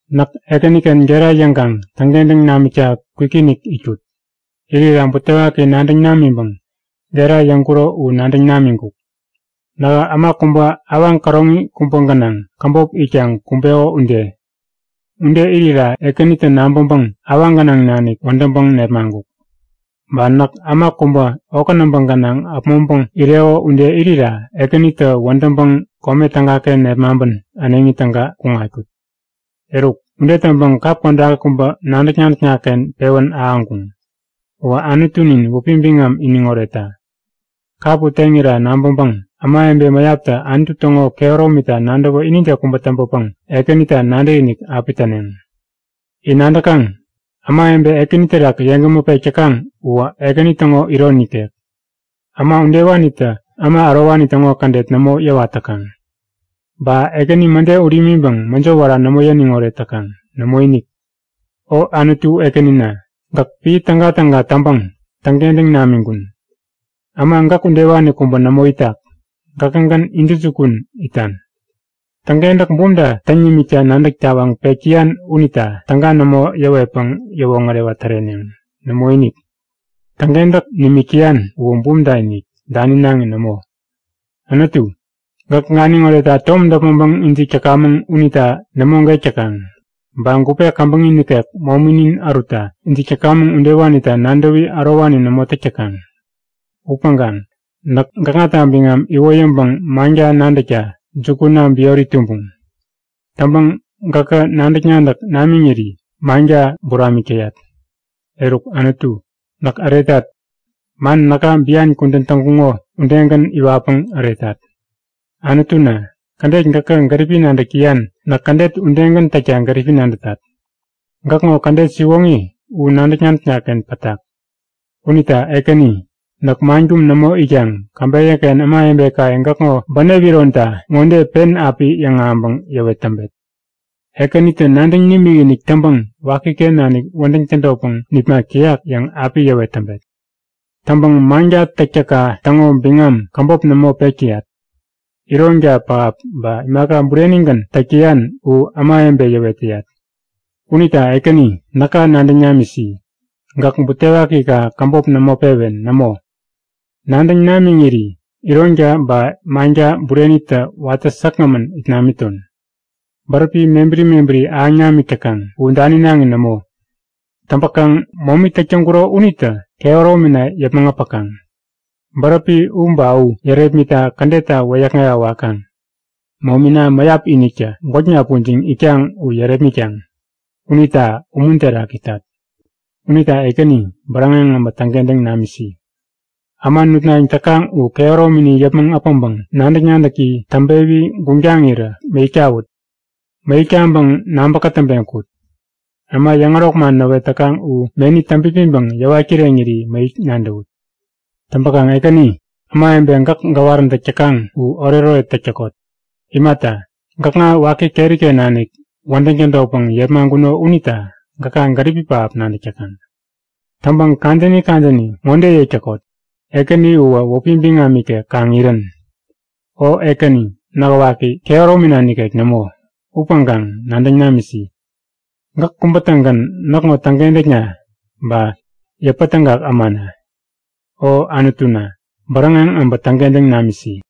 Näk Ekäniken gera yäŋkaŋ täŋkentäŋ namikta kwikinik itkut. Irira butewaki nadäŋ namiŋpäŋ gera yäŋkuro u nadäŋ namiŋkuk. Nähä äma kubä awaŋ käroŋi kubä gänaŋ käbop itkaŋ kumbeko ude. Ude irira Ekänitä nabäŋpäŋ awaŋ gänaŋ nanik wädäŋpäŋ nepmaŋkuk. Ba näk äma kubä okä näbä gänaŋ äpmoŋpäŋ ireko ude irira Ekänitä wädäŋpäŋ kome tägaken nepmaŋpän äneŋi täga kuŋatkut. Eruk, ude täŋpäŋ kap kodaki kubä nadäk-nadäkna-ken pewän ahäŋkuŋ. Uwä Anutunin wäpi biŋam iniŋ oretta. Kap u teŋira nabäŋpäŋ ämawebe mäyaptä Anutu täŋo kehäromita nadäwä inide kubä täŋpäpäŋ Ekänita nadäkinik api täneŋ. In nadäkaŋ? Ämawebe Ekäni terak yeŋgämä pek täkaŋ uwä Ekäni täŋo iron nikek. Äma udewanitä äma ärowani täŋo kädet nämo yäwat täkaŋ. Ba Ekäni mäde ut imiŋpäŋ mäjo wära nämo yäniŋ oret täkaŋ. Nämoinik! O Anutu Ekänina, gäk piä tägatäga täŋpäŋ täŋkentäŋ nimiŋkun. Äma gäk udewani kubä nämo itak! Gäkägän intäjukun itan! Täŋkentäk bumta täŋ nimikta nadäk tawaŋ pek täyan unita täga nämo yäwetpäŋ yäwoŋärewa täreneŋ. Nämoinik! Täŋkentäk nimik täyan uwä bumta-inik, daninaŋi nämo. Anutu, gäk ganiŋ oretta tom däpmäŋpäŋ ijik täkamäŋ unita nämo gek täkaŋ. Ba gupe käbäŋi nikek mominin ärutta ijik täkamäŋ udewanita nadäwi ärowani nämo täk täkaŋ. Upäŋkaŋ näk gäkŋata biŋam iwoyäŋpäŋ manka nadäkta jukuna biori tumbuŋ. Täŋpäŋ gäkä nadäk-nadäk namiŋiri manka buramik täyat. Eruk Anutu, näk äretat. Man näka bian kudän täŋkuŋo udegän iwatpäŋ äretat. Anutuna, kädet gäkä gäripi nadäk täyan näk kädet udegän täkta gäripi nadätat. Gäkŋo kädet siwoŋi u nadäk-nadäkna-ken pätak. Unita Ekäni, näk man kum nämo itkaŋ käbeyäken ämawebekaye gäkŋo bänep ironta ŋode pen api yäŋahäŋpäŋ yäwet täŋpet; Ekäninintä nadäŋ nimikinik täŋpäŋ wakiken nanik wädäŋ tädotpäŋ nipmak täyak yäŋ api yäwet täŋpet. Täŋpäŋ manka täktäkka täŋo biŋam käbop nämo pek täyat. Ironka pähap ba imaka burenigän täk täyan u ämawebe yäwet täyat. Unita Ekäni, näka nadäŋ namisi! Gäk butewakika käbop nämo pewen. Nämo, nadäŋ namiŋiri ironka ba manka burenitä watä säkgämän it namiton. Bäräpi mebäri mebäri ahäŋ namik täkaŋ, u daninaŋi nämo. Täŋpäkaŋ momi täk täŋkuro unitä kehäromina yäpmäŋ äpäkaŋ. Bäräpi u ba u yärepmitta kädetta wäyäkŋewa wakaŋ. Momina mäyap iniktä gwäkna pujiŋ itkaŋ u yärepmitkaŋ. Unita umun terak itat. Unita Ekäni, bäräŋeŋ abä täŋkentäŋ namisi! Äma nutnayäŋ täkaŋ u kehäromini yäpmäŋ äpäŋpäŋ nadäk-nadäki täŋpewi guŋtaŋirä mäyäk tawut. Mäyäk taŋpäŋ nabä-kätäŋpeŋ kut! Äma yäŋärok man näwet täkaŋ u meni täŋpipiŋpäŋ yäwat kireŋiri mäyäk nadäwut. Täŋpäkaŋ Ekäni, ämawebe gäk gäwaräntäk täkaŋ u oretoret täk täkot! Imata, gäkŋa waki keriken nanik wädäŋ tädotpäŋ yepmaŋkuno unita gäka gäripi pähap nadäk täkaŋ. Täŋpäŋ kadäni kadäni ŋode yäk täkot; Ekäni uwä wäpi biŋam ikek kaŋ irän! O Ekäni, nähä waki, kehäromina nikek nämo. Upäŋkaŋ nadäŋ namisi. Gäk kubä-tägän näkŋo täŋkentäkna ba yäpätägak ämana. O Anutuna, bäräŋeŋ äbä täŋkentäŋ namisi!